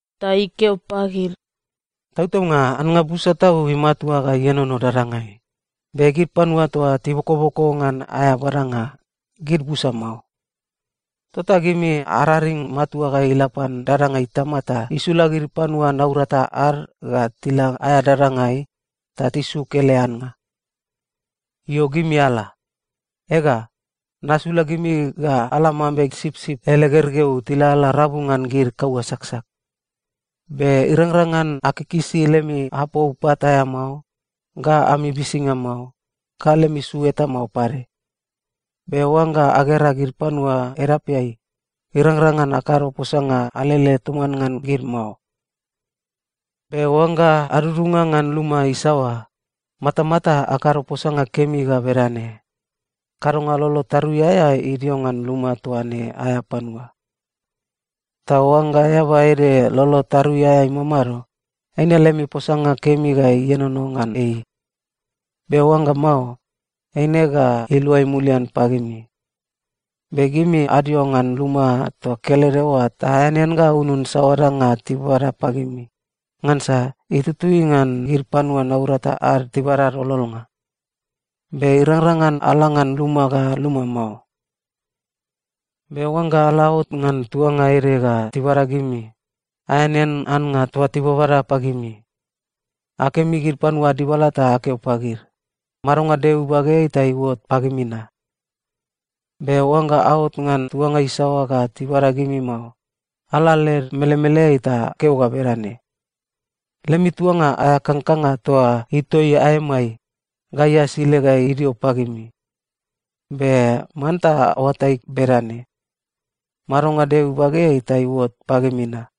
Ta ikeo pagid, “Tautaunga, annga busa tau imatua ga ienono dadangai, be gid panua toa tibokoboko ngan aea badanga, gid busa mao. Tota gimi araring matua ga ila pan dadanga Itama ta isula gid panua naurata ad ga tila aea dadangai ta tisuk ele annga. Io, gimi ala. Ega, nasula gimi ga ala mambe sipsip ele gergeu tilalala rabu ngan gid kaua saksak. Be irangrang ngan akikisi lemi apou pat aea mao, ga ami bisinga mao, ga lemi su eta mao pade. Be oangga agera gid panua edapeai, irangrang ngan akado posanga alele toman ngan gid mao. “Be oangga adudunga ngan luma isaoa, matamata akado posanga kemi ga bedane, ‘Kadonga lolo tarui aea idio ngan luma toa ne aea panua.’ Ta oangga eaba ede lolo tarui aea imamado, eine lemi posanga kemi ga ienono ngan ei. Be oangga mao, eine ga iluai mulian pagimi. Be gimi adio ngan luma toa kelede oa ta aeanean ga aunun saoa danga tibada pagimi, ngansa itutui ngan gid panua naurata ad tibada ad ololnga. Be irangrang ngan ala ngan luma ga luma mao. “Be oangga ala aot ngan tuanga ede ga tibada gimi, aeanean annga toa tibabada pagimi. Akemi gid panua ad dibala ta akeo pagid, ‘Madonga Deo ibageai ta iuot pagimi na.’ Be oangga aot ngan tuanga isaoa ga tibada gimi mao, ala led melemeleai ta akeo ga bedane, ‘Lemi tuanga aea kangkanga toa itoi aemai, gai asile ga idio pagimi. Be manta aoatai bedane: Madonga Deo ibageai ta iuot pagimi na.’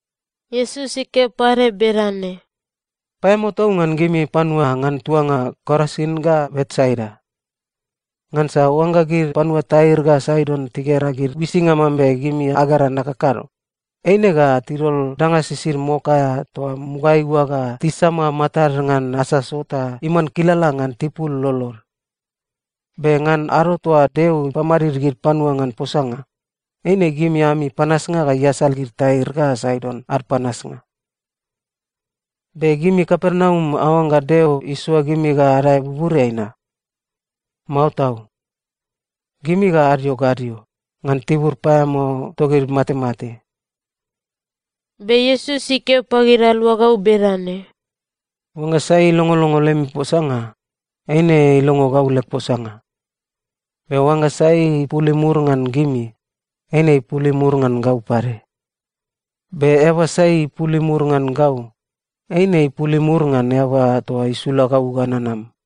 Iesus ikeo pade bedane, “Paeamao tau ngan gimi panua ngan tuanga Korasin ga Betsaida! Ngansa oangga gid panua Tair ga Saidon tigera gid uisinga mambe gimi agera nakakado, eine ga tidol danga sisid mok aea toa mugaeai oa ga tisama matad ngan asaso ta iman kilala ngan tipul lolod. Be ngan ado toa Deo ipamadid gid panua ngan posanga, eine gimi ami panasnga ga iasal gid Tair ga Saidon ad panasnga. Be gimi Kapernaum aoangga Deo isoa gimi ga adae buburiai na? Mao tau! Gimi ga adio gadio, ngan tibur paeamao togid matemate.” Be Iesus ikeo pagid aluagau bedane, “Oangga sai ilongolongo lemi posanga, eine ilongo gau leg posanga. Be oangga sai ipul imur ngan gimi, eine ipul imur ngan gau pade. Be eaba sai ipul imur ngan gau, eine ipul imur ngan Eaba toa isula gau ga nanam.”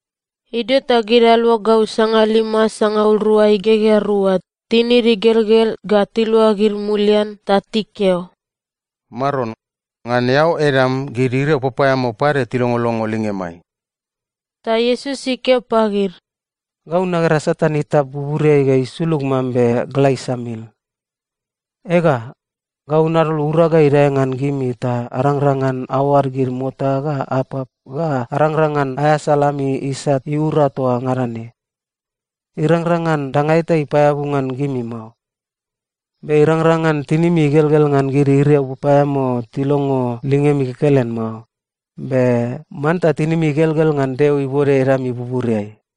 Idio ta gid aluagau sangalima sangaul rua igegea rua tinid igelgel ga tiluagid mulian ta tikeo, “Maron, ngan eao edam gid iriau papaeamao pade tilongolongo lingemai!” Ta Iesus ikeo pagid, “Gau nagera Satan itap buburiai ga isulug mambe gla isamil. Ega, gau nadol urag ga idae ngan gimi ta arangrang ngan aoad gid mota ga apap ga arangrang ngan aeasal ami isat iura toa ngada ne. Irangrang ngan danga eta ipaeabu ngan gimi mao. Be irangrang ngan tinimi igelgel ngan gid iriau papaeamao tilongo lingemi kekelen mao, be manta tinimi igelgel ngan Deo ibode edami buburiai.”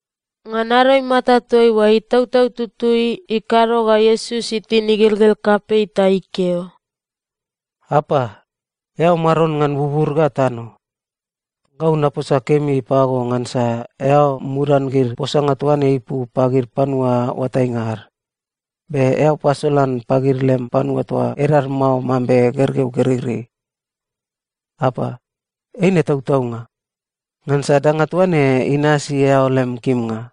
Ngan ado imata toaiua, Itautau Tutui ikado ga Iesus itin igelgel kapei ta ikeo, “Apa, eao Maron ngan bubur ga tano. Gau naposa kemi pago ngansa eao mudan gid posanga toa ne ipu pagid panua oatainga ad, be eao pasolan pagid lem panua toa edad mao mambe gergeu gereirei. Apa, eine tautaunga, ngansa danga toa ne inasi eao lem kimnga.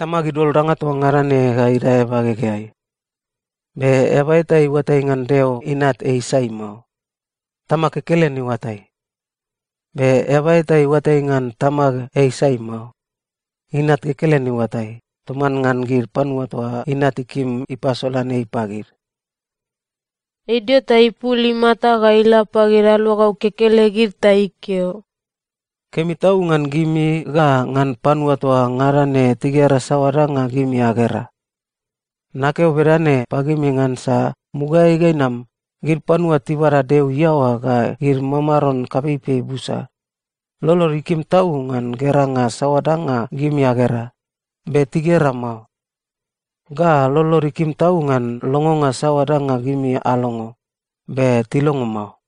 “Tamag idol danga toa ngada ne ga idae bagegeai. Be eaba eta iuatai ngan Deo Inat ei sai mao. Tamag kekelen iuatai. Be eaba eta iuatai ngan Tamag ei sai mao. Inat kekelen iuatai, toman ngan gid panua toa Inat ikim ipasolan ei pagid.” Idio ta ipul imata ga ila pagid aluagau kekelegid ta ikeo, “Kemi tau ngan gimi ga ngan panua toa ngada ne tigera saoa danga gimi agera! Nakeo bedane pagimi ngansa mugaeai ga inam, gid panua tibada Deo iaoa ga gid mamaron kapeipei busa, lolod ikim tau ngan geranga saoa danga gimi agera, be tigera mao. Ga lolod ikim tau ngan longonga saoa danga gimi alongo, be tilongo mao.”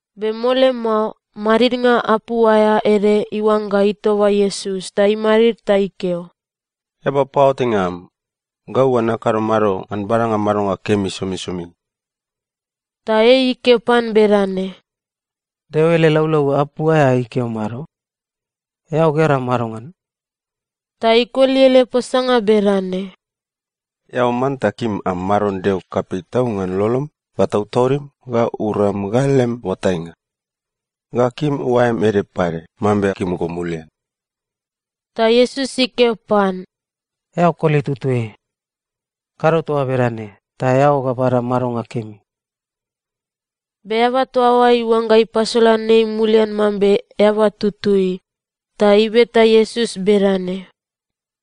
Be mole mao, madidnga apu aea ede iuangga itoba Iesus ta imadid ta ikeo, “Eaba paoatainga am, gau ga nakado mado ngan badanga madonga kemi somisomi?” Ta ei ikeo pan bedane, “Deo ele laulau apu aea ikeo mado? Eao gera madongan?” Ta ikoli ele posanga bedane, “‘Eao manta kim am Maron Deo kapei tau ngan lolom ga tautaudim ga uram ga lem oatainga.’ Ga ‘kim oaem ede pade mambe kim go mulian.’” Ta Iesus ikeo pan, “Eao koli tutui. Kado toa bedane, ta eao ga bada madonga kemi.” Be eaba toa oa iuangga ipasolan ei mulian mambe eaba tutui, ta ibeta Iesus bedane,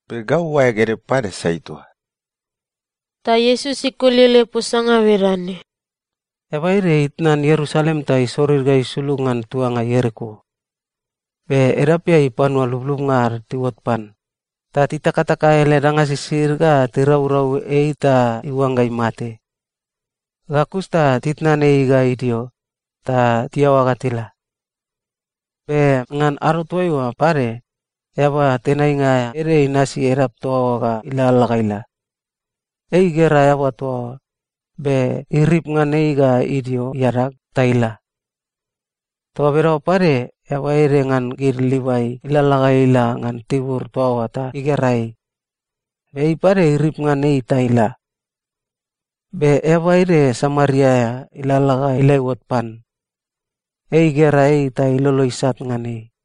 “Be gau oaeg ede pade sai toa?” Ta Iesus ikoli ele posanga bedane, “Eaba ede itnan Ierusalem ta isorir ga isulug ngan tuanga Ieriko. Be edapeai panua lublubnga ad tiuot pan, ta titakataka ele danga sisid ga tiraurau ei ta iuangga imate. Ga kus ta titnan ei ga idio, ta tiaoa ga tila. Be ngan ado toaiua pade, eaba tenainga aea ede inasi edap toa oa ga ilalala ga ila. Ei igera eaba toa oa, be irip ngan ei ga idio iadag ta ila. Toa bedaoa pade, eaba ede ngan gid Livai ilalala ga ila ngan tibur toa oa ta igera ei, be ei pade irip ngan ei ta ila. Be eaba ede Samaria aea ilalala ga ila iuot pan. Ei igera ei ta ilolo isat ngan ei.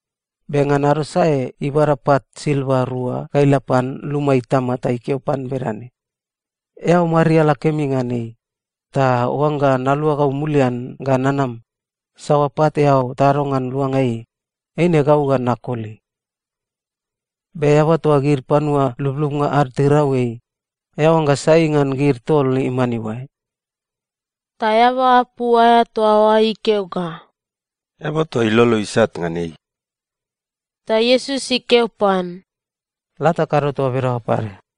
Be ngan ado sae ibada pat silva rua ga ila pan luma itama ta ikeo pan bedane, ‘Eao mariala kemi ngan ei, ta oangga naluagau mulian ga nanam, saoa pat eao tado ngan luanga ei, eine gau ga nakoli.’ “Be eaba toa gid panua lublubnga ad tirau ei, eao oangga sai ngan gid tol iman iuae?” Ta eaba apu aea toa oa ikeo ga, “Eaba toa ilolo isat ngan ei.” Ta Iesus ikeo pan, “La, ta kado toa bedaoa pade.”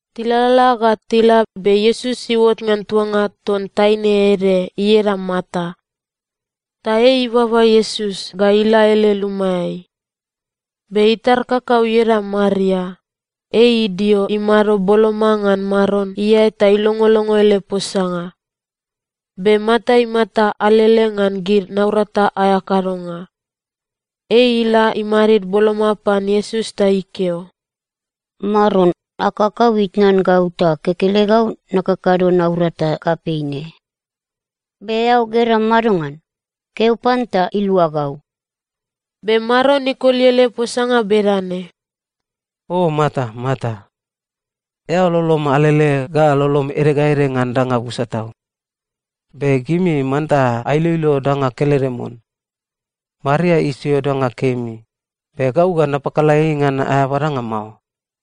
Tilalala ga tila, be Iesus iuot ngan tuanga ton taine ede ieda Marta. Ta ei ibaba Iesus ga ila ele lumaeai. Be itar kakau ieda Maria, ei idio imado boloma ngan Maron iae ta ilongolongo ele posanga. Be Marta imata alele ngan gid naurata aea kadonga. Ei ila imadid boloma pan Iesus ta ikeo, “Maron, ag kakau itnan gau ta kekelegau nakakado naurata kapei ne. Be eao gera madongan? Keo pan ta ilua gau.” Be Maron ikoli ele posanga bedane, “O Marta, Marta. Eao lolom alele ga lolom ede ga ede ngan danga busa tau. Be gimi manta ailoilo danga kelede mon. Maria isio danga kemi, be gau ga napakala ei ngan aea badanga mao.”